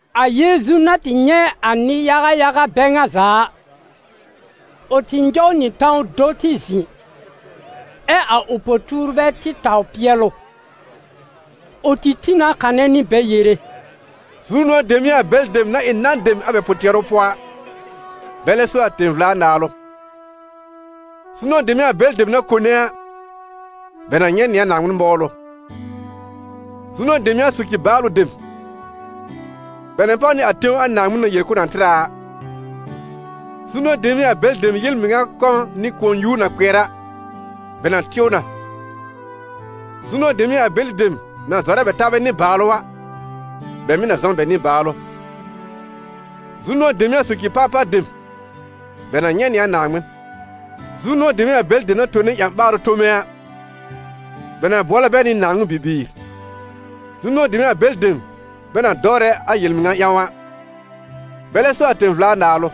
A Yeezu na tɩ nyɛ̃ a nɩ-yaga yaga bɛ ŋa za a, ʋ tɩ nyɔw nɩ tãw do tɩ zɩ̃, ɛ a ʋ po-tuurbɛ tɩ taw pɩɛl ʋ. Ʋ tɩ tĩ na kanɛ nɩ bɛ yere: «Zu-nʋ̃ɔ̀ dem n'ɩ a bɛlɩ dem na ɩ nan dem a bɛ pʋ-tɩɛrʋ pʋɔ a, bɛlɛ so a tẽ-vla-Naalʋ. Zu-nʋ̃ɔ̀ dem n'ɩ a bɛlɩ dem na kone a, bɛ na nyɛ̃ nɩ a Naaŋmɩn mɔwlʋ. Zu-nʋ̃ɔ̀ dem n'ɩ a soci-baalʋ dem, bɛ na páw nɩ a tẽw a Naaŋmɩn na yel k'ʋʋ na tɩr a a. Zu-nʋ̃ɔ̀ dem n'ɩ a bɛlɩ dem yel-mɩŋa kɔ̃ nɩ kʋ̃ɔ-nyuur na kpɩɛr a, bɛ na tɩw na. Zu-nʋ̃ɔ̀ dem n'ɩ a bɛlɩ dem na zɔrɛ a bɛ taabɛ nɩ-baalʋ a, bɛ mɩ̀ na zɔ n bɛ nɩ-baalʋ. Zu-nʋ̃ɔ̀ dem n'ɩ a soci-parpar dem, bɛ na nyɛ̃ nɩ a Naaŋmɩn. Zu-nʋ̃ɔ̀ dem n'ɩ a bɛlɩ dem na tone ƴã-ɓaarʋ tome a, bɛ na bʋɔlɛ bɛ nɩ Naaŋmɩn bibiir. Zu-nʋ̃ɔ̀ dem n'ɩ a bɛlɩ dem bɛ na dɔwrɛ a yel-mɩŋa ƴãw a, bɛlɛ so a tẽ-vla-naalʋ.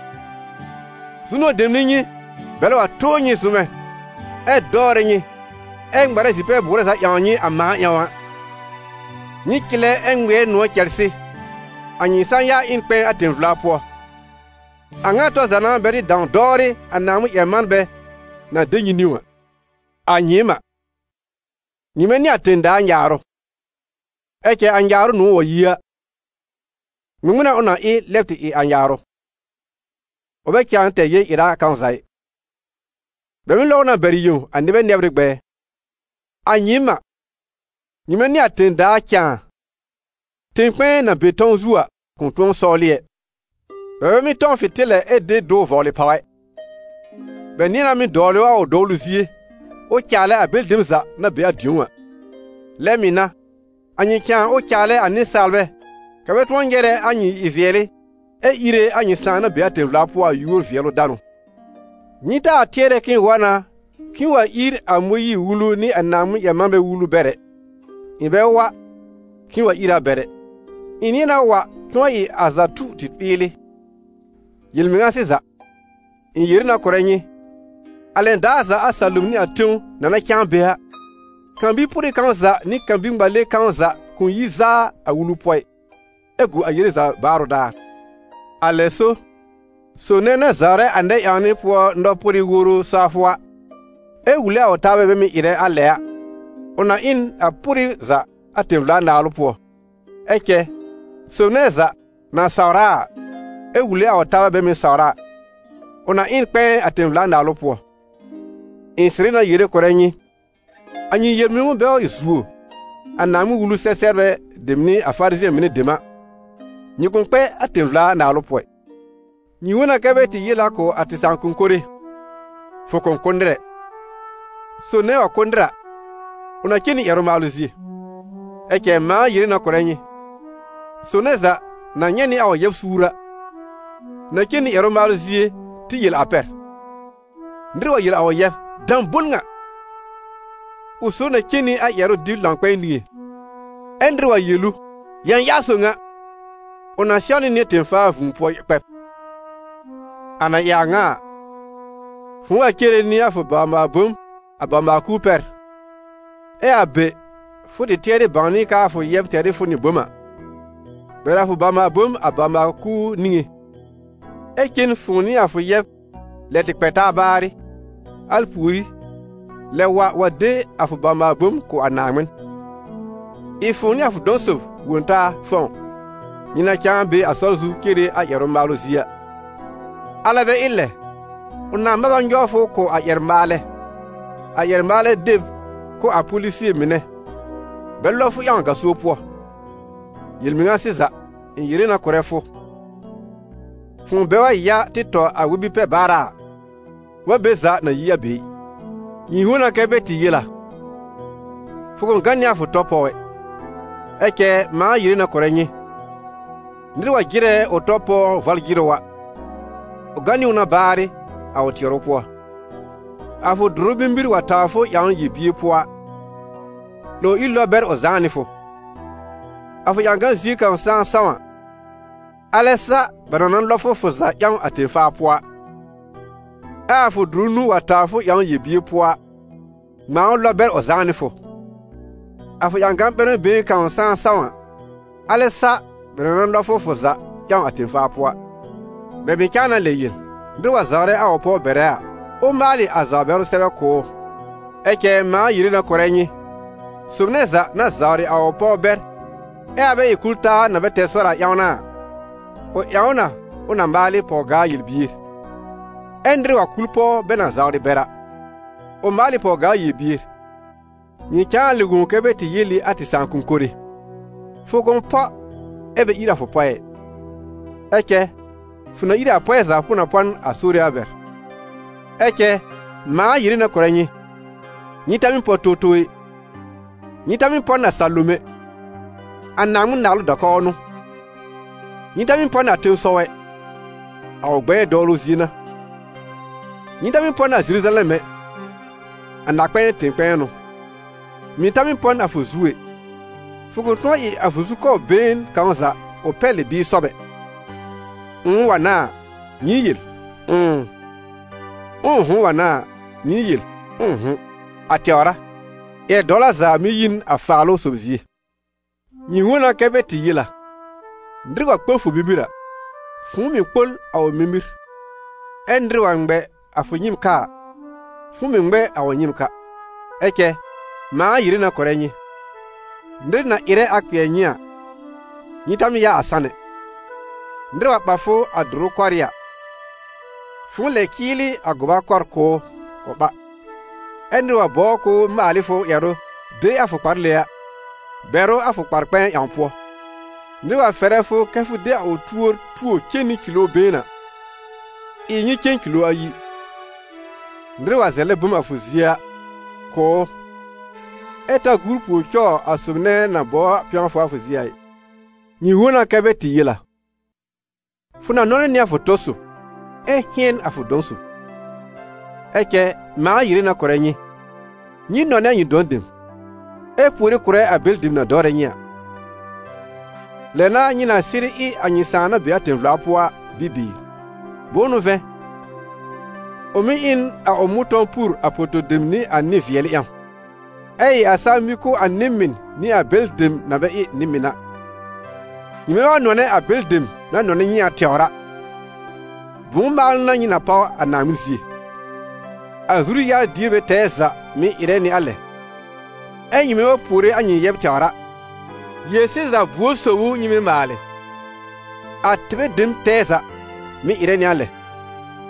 Zu-nʋ̃ɔ̀ dem n'ɩ nyɩ, bɛlɛ wa tʋʋr nyɩ zʋmɛ, ɛ dɔwrɛ nyɩ, ɛ ŋmarɛ zi-pɛ-bʋʋrɛ za ƴãwn nyɩ, a mãa ƴãw a. Nyɩ cɩlɛ ɛ ŋmɩɛr nʋ̃ɔ̀ cɛlsɩ, a nyɩ sã-ya ɩ n kpɛ̃ɛ a tẽ-vla pʋɔ; a ŋa tɔr za n'a bɛ tɩ dãw dɔwrɩ a Naaŋmɩn-ƴɛr-manbɛ na de nyɩ niwn a.» «A nyɩɩm a, nyɩmɛ n'ɩ a tẽ-daa nyaarʋ. Ɛ cɛ a nyaarʋ nʋ̃ɔ̀ wa yi a, ŋmɩŋmɩn n'a ʋ na ɩ lɛb tɩ ɩ a nyaarʋ? Ʋ bɛ cãa tɛr yel-ɩra kãw za ɩ, bɛ mɩ́ lɔb ʋ na bɛr yẽw a nɩbɛ nɛbr ɩ gbɛɛ. A nyɩɩm a, nyɩmɛ n'ɩ a tẽ-daa cãa. Tẽ-kpɛ̃ɛ na be tãw zu a, kʋ̃ tʋ̃ɔ sɔwlɩ ɛ. Bɛ bɛ mɩ́ tɔ̃w fɩ̃tɩlɛ ɛ de dʋw vɔblɩ pàw ɛ. Bɛ nɩ̃ɛ na mɩ́ dɔwl ʋ a ʋ dɔwlʋ zie, ʋ caalɛ a bɛlɩ dem za na be a dĩ̀ó a. Lɛ mɩ̀ n'a, a nyɩ cãa, ʋ caalɛ a nɩsaalbɛ, kɛ̀ bɛ tʋ̃ɔ nyɛrɛ a nyɩ ɩ-vɩɛlɩ ɛ íre a nyɩ Sãà na be a tẽ-vla pʋɔ a yúor-vɩɛlʋ-danʋ.» «Nyɩ taa tɩɛrɛ k'ɩ̃ɩ wa na k'ɩ̃ɩ wa ír a Mõyiir-Wulu nɩ a Naaŋmɩn-ƴɛr-manbɛ wulu bɛr ɛ. Ɩ̃ bɛ wa k'ɩ̃ɩ wa ír a bɛr ɛ, ɩ̃ nɩ̃ɛ na wa k'ɩ̃ɩ wa ɩ a za tu tɩ ɓɩɩlɩ. Yel-mɩŋa sɩza, ɩ̃ yere na kʋ̀rɛ nyɩ: a lɛn daar za a salom nɩ a tẽw na na cãa be a, kan-bi-pʋrɩ kãw za nɩ kan-bi-ŋmale kãw za kʋ̃ yi zaa a Wulu pʋɔ ɩ, ɛ gu a yele za baarʋ daar. A lɛ so, sob nɛ na zawrɛ a nɛ-ƴãwnɩ pʋɔ nɔ-pʋrɩ woro sawfʋ a, ɛ wule a ʋ taabɛ bɛ mɩ̀ ɩrɛ a lɛ a, ʋ na ɩ n a pʋrɩ za a tẽ-vla-naalʋ pʋɔ; ɛ cɛ sob nɛ za na sawr a a, ɛ wule a ʋ taabɛ bɛ mɩ̀ sawr a, ʋ na ɩ n kpɛ̃ɛ a tẽ-vla-Naalʋ pʋɔ. Ɩ̃ sɩrɩ na yere kʋ̀rɛ nyɩ: a nyɩ yel-mɩnʋ bɛ wa zuo a Naaŋmɩn-Wulu-sɛ-sɛbrbɛ dem nɩ a Farizɩ̃ɛ mɩnɛ dem a, nyɩ kʋ̃ kpɛ a tẽ-vla-Naalʋ pʋɔ ɩ.» «Nyɩ wõ na kɛ́ bɛ tɩ yel a kʋ̀ a tɩ sãakʋm mɩnɛ: ‹Fʋ kʋ̃ kʋ́ nɩr ɛ; sob nɛ wa kʋ́ nɩr a, ʋ na cen nɩ ƴɛrʋ-maalʋ zie.› Ɛ cɛ mãa yere na kʋ̀rɛ nyɩ: sob nɛ za na nyɛ̃ nɩ a ʋ yɛb suur a, na cen nɩ ƴɛrʋ-maalʋ zie tɩ yel a pɛr; nɩr wa yel a ʋ yɛb: ‹Dãbol ŋa!› ʋ sob na cen nɩ a ƴɛrʋ-dɩb-lãw-kpɛ̃ɛ niŋé. Ɛ nɩr wa yel ʋ: ‹Yãyaar sob ŋa!› ʋ na sɛwnɩ nɩ tẽ-faa vũu pʋɔ kpɛb. A na ɩ a ŋa a, fʋ̃ʋ wa cere nɩ a fʋ bawr-maal-bom a bawr-maal-kuur pɛr, ɛ a be fʋ tɩ tɩɛrɩ bãwnɩ a k'aa fʋ yɛb tɛr ɩ fʋ nɩ bom a, bɛr a fʋ bawr-maal-bom a bawr-maal-kuur niŋé, ɛ cen fʋ̃ʋ nɩ a fʋ yɛb lɛ tɩ kpɛ taa baarɩ, al pùorí, lɛb wa wa de a fʋ bawr-maal-bom kʋ̀ a Naaŋmɩn. Ɩ fʋ̃ʋ nɩ a fʋ dɔ̃ sob wõ taa fɔ̃w, nyɩ na cãa be a sɔr zu cere a ƴɛrʋ-maalʋ zie a; alɛ bɛ ɩ lɛ, ʋ nãá mab a nyɔw fʋ kʋ̀ a ƴɛr-maalɛ, a ƴɛr-maalɛ de b kʋ̀ a polisie mɩnɛ, bɛ lɔb fʋ ƴãw gaso pʋɔ. Yel-mɩŋa sɩza, ɩ̃ yere na kʋ̀rɛ fʋ: fʋ̃ʋ bɛ wa ya tɩ tɔ a wɛ-bi-pɛ-baara a, fʋ bɛ be za na yi a be ɩ.» «Nyɩ wõ na kɛ́ bɛ tɩ yel a: ‹Fʋ kʋ̃ gã nɩ a fʋ tɔ pɔw ɛ.› Ɛ cɛ mãa yere na kʋ̀rɛ nyɩ: nɩr wa jɩrɛ ʋ tɔ pɔw vɔl-jɩrʋ a, ʋ gã nɩ ʋ na baarɩ a ʋ tɩɛrʋ pʋɔ. A fʋ dʋrʋ mimir wa tawr fʋ ƴãwn yel-bier pʋɔ a, 'lòw ír lɔb bɛr ʋ zãá nɩ fʋ; a fʋ ƴãgan zie kãw saa sãw a, alɛ sa bɛ na na lɔb fʋ fʋ za ƴãw a tẽ-faa pʋɔ a. Ɛ a fʋ dʋrʋ nũu wa tawr fʋ ƴãwn yel-bier pʋɔ a, ŋmãa ʋ lɔb bɛr ʋ zãá nɩ fʋ; a fʋ ƴãgan ɓɛrmɛ been kãw saa sãw a, alɛ sa bɛ na na lɔb fʋ fʋ za ƴãw a tẽ-faa pʋɔ a.» «Bɛ mɩ̀ cãa na lɛ yel: ‹Nɩr wa zawrɛ a ʋ pɔw bɛrɛ a, ʋ maalɩ a zawr-bɛrʋ sɛbɛ kʋ̀ ʋ.› Ɛ cɛ mãa yere na kʋ̀rɛ nyɩ: sob nɛ za na zawrɩ a ʋ pɔw bɛr, ɛ a bɛ ɩ kul-taa na bɛ tɛr sɔr a ƴãw n'a a, ʋ ƴãw ʋ na ʋ na maalɩ pɔw-gaa yel-bier. Ɛ nɩr wa kul pɔw bɛ na zawrɩ bɛr a, ʋ maal ɩ pɔw-gaa yel-bier.» «Nyɩ cãa na lɛ wõ kɛ́ bɛ tɩ yel ɩ a tɩ sãakʋm mɩnɛ: ‹Fʋ kʋ̃ pɔ ɛ bɛ ír a fʋ pɔɛ ɛ, ɛ cɛ fʋ na ír ɩ a pɔɛ za fʋ na pɔ n a Sore a bɛr.› Ɛ cɛ mãa yere na kʋ̀rɛ nyɩ: nyɩ ta mɩ́ pɔ towtow ɛ; nyɩ ta mɩ́ pɔ n a salom ɛ, a Naaŋmɩn naalʋ da-kɔw n'ʋ; nyɩ ta mɩ́ pɔ n a tẽsɔw ɛ, a ʋ gbɛɛ dɔwlʋ zie n'a; nyɩ ta mɩ́ pɔ n a Zeruzalɛm ɛ, a Na-kpɛ̃ɛ tẽ-kpɛ̃ɛ n'ʋ. Mɩ̀ ta mɩ́ pɔ n a fʋ zu ɛ, fʋ kʋ̃ tʋ̃ɔ ɩ a fʋ zukɔbr been kãw za ʋ pɛlɩ bɩɩ sɔb ɛ. Ʋ̃ʋ wa n'a a, nyɩ yel: ‹Ʋ̃ʋ›; ʋ̃ʋ'hʋ̃ wa n'a a, nyɩ yel: ‹Ʋ̃ʋ'hʋ̃›, a tɛwr a; yɛr-dɔwla za mɩ́ yi n a Faalʋ-sob zie.» «Nyɩ wõ na kɛ́ bɛ tɩ yel a: ‹Nɩr wa kpol fʋ mimir a, fʋ̃ʋ mɩ̀ kpol a ʋ mimir; ɛ nɩr wa ŋmɛ a fʋ nyɩ́ɩm ka a, fʋ̃ʋ mɩ̀ ŋmɛ a ʋ nyɩ́ɩm ka.› Ɛ cɛ mãa yere na kʋ̀rɛ nyɩ: nɩr na ɩrɛ a kpɩɛr nyɩ a, nyɩ ta mɩ́ yaa a san ɛ. Nɩr wa ɓa fʋ a dʋrʋ kɔrɩ́ a, fʋ̃ʋ lɛ cɩɩlɩ a gʋba kɔr kʋ̀ ʋ ʋ ɓa. Ɛ nɩr wa bɔbr k'ʋʋ maal ɩ fʋ ƴɛrʋ de a fʋ kpale a, bɛr ʋ a fʋ kpar-kpɛ̃ɛ ƴãw pʋɔ. Nɩr wa fɛrɛ fʋ kɛ́ fʋ de a ʋ tuor tuo cen nɩ kilo been a, ɩ nyɩ cen kilo ayi. Nɩr wa zɛlɛ bom a fʋ zie a, kʋ̀ ʋ, ɛ ta gur pùor cɔw a sob nɛ na bɔbr pɛ̃wfʋ a fʋ zie a ɩ.» «Nyɩ wõ na kɛ́ bɛ tɩ yel a: ‹Fʋ na nɔnɛ nɩ a fʋ tɔ sob, ɛ hɩ̃ɛn a fʋ dɔ̃ sob.› Ɛ cɛ mãa yere na kʋ̀rɛ nyɩ: nyɩ nɔnɛ a nyɩ dɔ̃ dem, ɛ puore kʋ̀rɛ a bɛlɩ dem na dɔwrɛ nyɩ a. Lɛ n'a nyɩ na sɩrɩ ɩ a nyɩ Sãà na be a tẽ-vla pʋɔ a bibiir; bʋ̃ʋ n'ʋ vɛ̃, ʋ mɩ́ ɩ n a ʋ mʋ̃tɔ̃w pur a poto-dem nɩ a nɩ-vɩɛlɩ ƴãw, ɛ ɩ a saa mĩ kʋ̀ a nɩ-mɩn nɩ a bɛlɩ dem na bɛ ɩ nɩ-mɩn a. Nyɩmɛ wa nɔnɛ a bɛlɩ dem na nɔnɛ nyɩ a tɛwr a, bʋ̃ʋ maalʋ n'a nyɩ na páw a Naaŋmɩn zie? A zuru-yar-dierbɛ tɛɛ za mɩ̀ ɩrɛ nɩ a lɛ! Ɛ nyɩmɛ wa puore a nyɩ yɛbr tɛwr a, yel-sɩza buor sob ʋ nyɩ mɩ́ maalɩ? A tɩbɛ dem tɛɛ za mɩ̀ ɩrɛ nɩ a lɛ.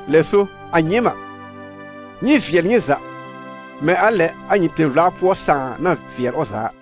Lɛ so, a nyɩɩm a, nyɩ vɩɛl nyɩ za, mɛ̃ a lɛ a nyɩ tẽ-vla pʋɔ Sãà na vɩɛl ʋ za a.